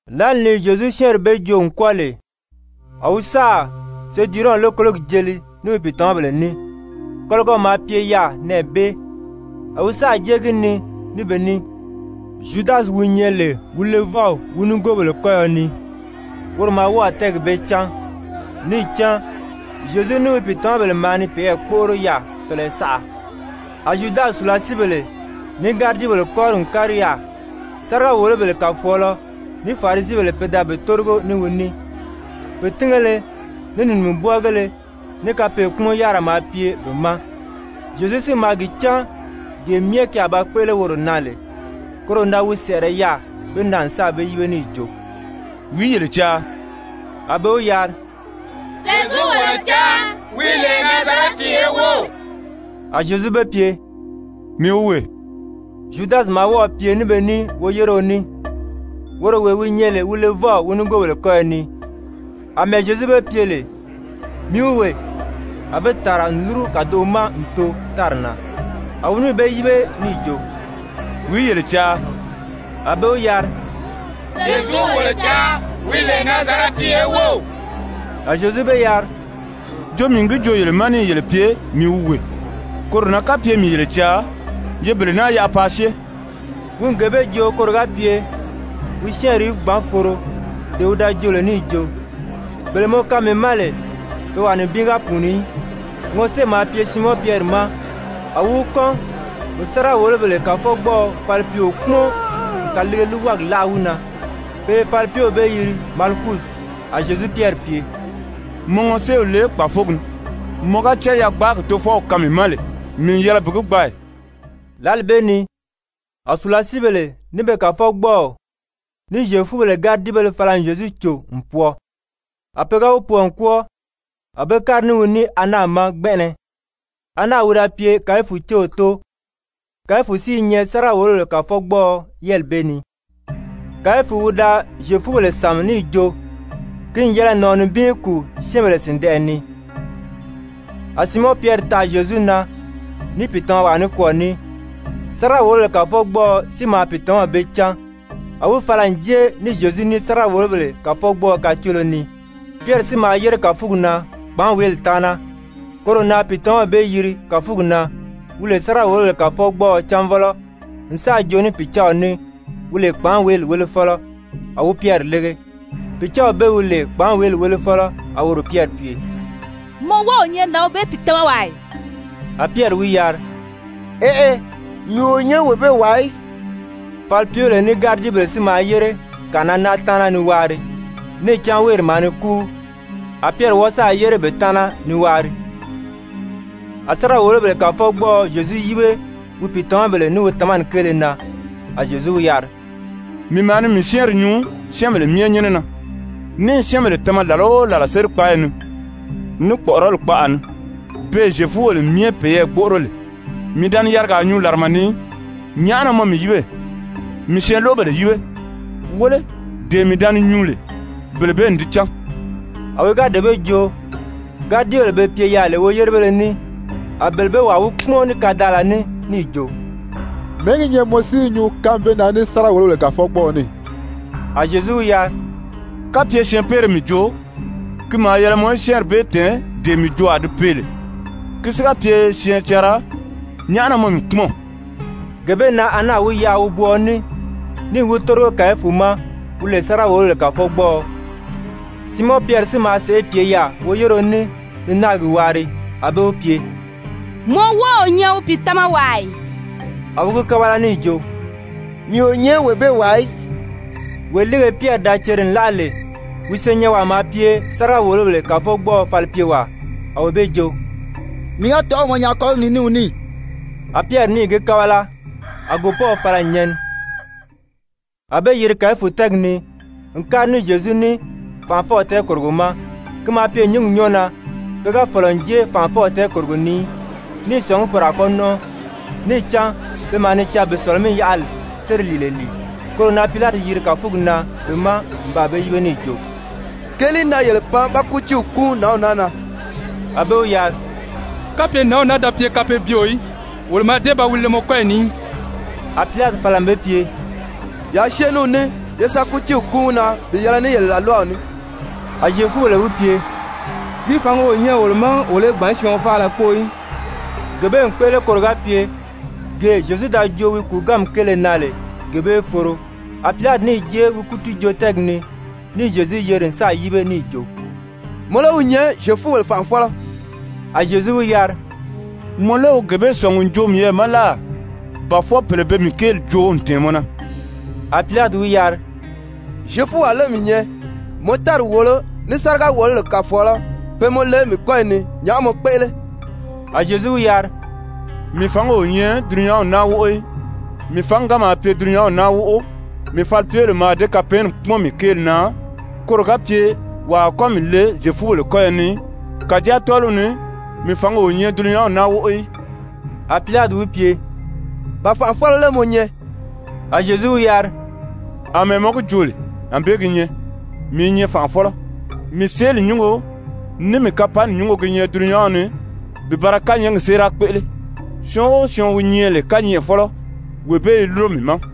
Lǎli ni Zyezu syɛ́ɛnri bee joo n kwɔ́ɔ lè, a wi sáà Sedurɔn lókologi jeli ní wi pìitamabèle ní, kɔligɔ maa pye yaà nɛɛ bee, a wi sáà jée gi ni ní be ní. Zyudasi wi nyɛ lè wi levɔw wi nigoobèle kɔ́yɔ ni, woro maa wɔ́ɔ̀ tɛ́ɛgi bee cán, níì cán Zyezu ní wi pìitamabèle maa ni peyɛɛ gbóʔoro yaà tɔlɔyɔ saʔa. A Zyudasi sùlasiibèle, ní gáridibèle kɔ́ri n kári yaà, sáriga-wòlobèle kàfɔɔlɔ, ní Farisibèle pe da be tórigo ní wi ní, fètingéle, ní nìmubwɔɔgéle, ní kapɛɛnkpumɔn-yárira maa pye be ma. Zyezu si maa gi cán gee myɛ ki a ba kpéʔele woro na lè, koro na wi sɛ̀ʔɛrɛ yaà be ma n sáà be yíbe níì jo: «Wìí yele caa?» A be wi yari: «Zyezu wolo caa, wi lè Nazarɛti ye wów.» A Zyezu be pye: «Mii wi wee.» Zyudasi maa wɔ́ɔ̀ pye ní be ní woyéreo ní, woro wee wi nyɛ lè wi levɔw wi nigoobèle kɔ́yɔ ni. Amɛɛ Zyezu be pye lè: «Mii wi wee,» a be tàra n lúru kàdoʔo ma n too tári na. A wi níì be yíbe níì jo: «Wìí yele caa?» A be wi yari: «Zyezu wolo caa, wi lè Nazarɛti ye wów.» A Zyezu be yari: «Jo mii n gi joo yele ma níì yele pye, mii wi wee. Koro na kapye mii yele caa, ye bele naa yaʔa paa syée.» (Wi n gee bee joo koro ga pye wi syɛ́ɛnri í gbǎn foro, dee wi da joo lè níì jo: «Bele mɔ kaan mii ma lè, pe wàa nibin ga pùuni í.») Ŋɔsée maa pye Siimɔn Pyɛri ma, a wi wi kɔ́n n sáriga-wòlobèle kàfɔgbɔɔɔ falipyeo kpúmɔn n kàliige líiwagi láʔa wi na. Pe i falipyew bee yiri Malikusi. A Zyezu Pyɛri pye: «Mɔ ŋɔséew le kpàfogi ni. Mɔ ga cán yagbaagi Tofɔw kaan mii ma lè, mii n yɛlɛ bi gi gbaa ì?» Lǎli bee ni a sùlasiibèle, ní be kàfɔgbɔɔw, ní Zyefubèle gáridibéle fala n Zyezu cò n pwɔɔ. A pe ga wi pwɔɔ n kwɔ́ɔ, a be kári ní wi ní Ana ma gbɛnʔɛnɛ. Ana wi da pye Kayifu céw tóo, Kayifu si i nyɛ sáriga-wòlobèle kàfɔgbɔɔɔ yɛ́ɛli bee ni. Kayifu wi da Zyefubèle sàmi níì jo ki n yɛlɛ nàɔn nibin í kùu syɛ́ɛnbèle sìndɛʔɛ ni. A Siimɔn Pyɛri taʔa Zyezu na, ní pìitamawaa nikwɔɔ ní. Sáriga-wòlobèle kàfɔgbɔɔɔ si maa pìitamaw bee cán, a wi fala n jée ní Zyezu ní sáriga-wòlobèle kàfɔgbɔɔɔ kacoolo ni. Pyɛri si maa yére kàfugi na kpàánweeli taana, koro na pìitamaw bee yiri kàfugi na, wi lè sáriga-wòlobèle kàfɔgbɔɔɔ cánvɔlɔ, n sáà joo ní pìcaaw ní, wi lè kpàánweeli wélefɔlɔ, a wi Pyɛri lége. Pìcaaw bee wi lè kpàánweeli wélefɔlɔ a woro Pyɛri pye: «Mɔ wɔ́ɔ o nyɛ nǎnw bee pìitamawaa ì?» A Pyɛri wi yari: «Eʔe, mii o nyɛ wee bee wàa í.» Falipyebèle ní gáridibèle si maa yére kànʔana náa taana ni waari, níì cán wéeri maa ni kúu. A Pyɛri wɔ́ɔ sáà yére be taana ni waari. A sáriga-wòlobèle kàfɔgbɔɔɔ Zyezu yíbe wi pìitamabèle, ní wi tamani kéele na. A Zyezu wi yari: «Mii maa ni mii syɛ́ɛnri nyuu syɛ́ɛnbèle myɛ nyɛ́nɛ na, ní i syɛ́ɛnbèle tama làla o làla sérikpaayi ni, ní kpɔ̀ʔɔrɔli kpaʔa ni, beè Zyefubèle myɛ peyɛɛ gbóʔoro lè. Mii da ni yarigaa nyuu làrama ni í. Nyàʔá na mɔ mii yíbe? Mii syɛɛnloʔobèle yíbe. Wéle, dee mii da ni nyuu lè, bele bee n di cán.» A wi ga dee bee joo, gáridibèle be pye yaà lè woyérebéle ní, a bele bee wàa wi kpúmɔn ní kadaala ní níì jo: «Mɛ̀ɛ́ gi nyɛ mɔ si i nyuu kánmi bee na ní sáriga-wòlobèle kàfɔgbɔɔɔ ní?» A Zyezu wi yari: «Kapye syɛɛnpeere mii joo, ki maa yɛlɛ mɔ í syɛ́ɛnri bee tɛ̀ɛn dee mii joo a di pee lè. Ki si ga pye syɛɛncanra, nyàʔá na mɔ mii kpúmɔn?» Gee bee na Ana wi yaʔa wobwɔɔɔ ní níì wi tórigo Kayifu ma, wi lè sáriga-wòlobèle kàfɔgbɔɔɔ. Siimɔn Pyɛri si maa sèʔê pye yaà woyéreo ní ni náagi waari, a be wi pye: «Mɔ wɔ́ɔ o nyɛ wi pìitamawaa ì?» A wi gi kábala níì jo: «Mii o nyɛ wee bee wàa í.» Wee líige Pyɛri da ceri n láʔa lè, wi senyɛnwaa maa pye sáriga-wòlobèle kàfɔgbɔɔɔ falipyewaa, a wee bee jo: «Mii ga tɔ̀ʔɔ̂ mɔ nyaa kɔ́ligi ni ní wi ní ì?» A Pyɛri níì gi kábala. A gòpɔ́w fala n nyɛni. A be yiri Kayifu tɛ́ɛgi ni n kári ní Zyezu ní fànʔafɔw tɛɛkòrogo ma, ki maa pye nyǐngi nyɔ́ɔ na. Pe ga fɔ̀lɔ n jée fànʔafɔw tɛɛkòrogo ni í, ní i sɔ̀ngí poro a kɔ́ nɔ́nʔɔ, níì cán pe maa ni caa bi Sɔ̀lɔ-mí-yaʔali séri lìile lìi. Koro na Pilati yiri kàfugi na be ma n baa be yíbe níì jo: «Keelìí na yele pan ba kútiiw kúun nǎnw naa na?» A be wi yari: «Kapye nǎnw naa da pye kapeebyeo í, wolo mǎà dée ba wi le mɔ kɔ́yi ni í.» A Pilati fala n be pye: «Yaa syée ní wi ní, ye sa kútiiw kúun wi na bi yɛlɛ ní yele làlwaw ní.» A Zyefubèle wi pye: «Ki fǎngi o nyɛ wolo ma wolo í gbǎn syɔɔn faala kpóo í.» Gee bee n kpéʔele koro ga pye gee Zyezu da joo wi kùuganmi kéele na lè, gee bee í foro. A Pilati níì jée wi kútiijoo-tɛ́ɛgi ni, níì Zyezu yeri n sáà yíbe níì jo: «Mɔ lé wi nyɛ Zyefubèle fànʔafɔlɔ?» A Zyezu wi yari: «Mɔ lé wi gee bee sɔ̀ngi n joo miyɛɛ ma láà ba fwɔɔ pèle be mii kéeli joo n tɛ̀ɛn mɔ na?» A Pilati wi yari: «Zyefuwaa lé mii nyɛ? Mɔ tári wòolo ní sáriga-wòlobèle kàfɔɔlɔ pe mɔ le mii kɔ́yi ni. Nyàʔá mɔ kpéʔele?» A Zyezu wi yari: «Mii fǎngi o nyɛ dulunyanw naa wóʔo í. Mii fǎngi ga maa pye dulunyanw naa wóʔo, mii falipyebèle mǎà dée kapɛɛnni kpúmɔn mii kéeli na koro ga pye wàa a kɔ́ mii le Zyefubèle kɔ́yɔ ni í. Kàjáa tɔ́ɔliw ni mii fǎngi o nyɛ dulunyanw naa wóʔo í.» A Pilati wi pye: «Ba fànʔafɔlɔ lé mɔ nyɛ?» A Zyezu wi yari: «Amɛɛ mɔ gi joo lè, ànbée gi nyɛ, mii i nyɛ fànʔafɔlɔ. Mii seeli nyúngo, ní mii kapanni nyúngo gi nyɛ dulunyanw ni bi ba ra kányɛɛgi séera kpéʔele. Syɔɔn o syɔɔn wi nyɛ lè kányɛʔɛfɔlɔ, wee bee i lúro mii ma.»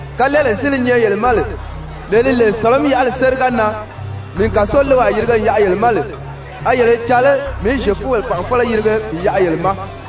Kalɛɛlee si li nyɛ yele ma lè, lee li lè, Sɔ̀lɔ-mí-yaʔali séri ga nan mii n kàsolewaa yirige n yaʔa yele ma lè, a yele i caa lé mii í Zyefubèle fànʔafɔlɔ yirige bi yaʔa yele ma?»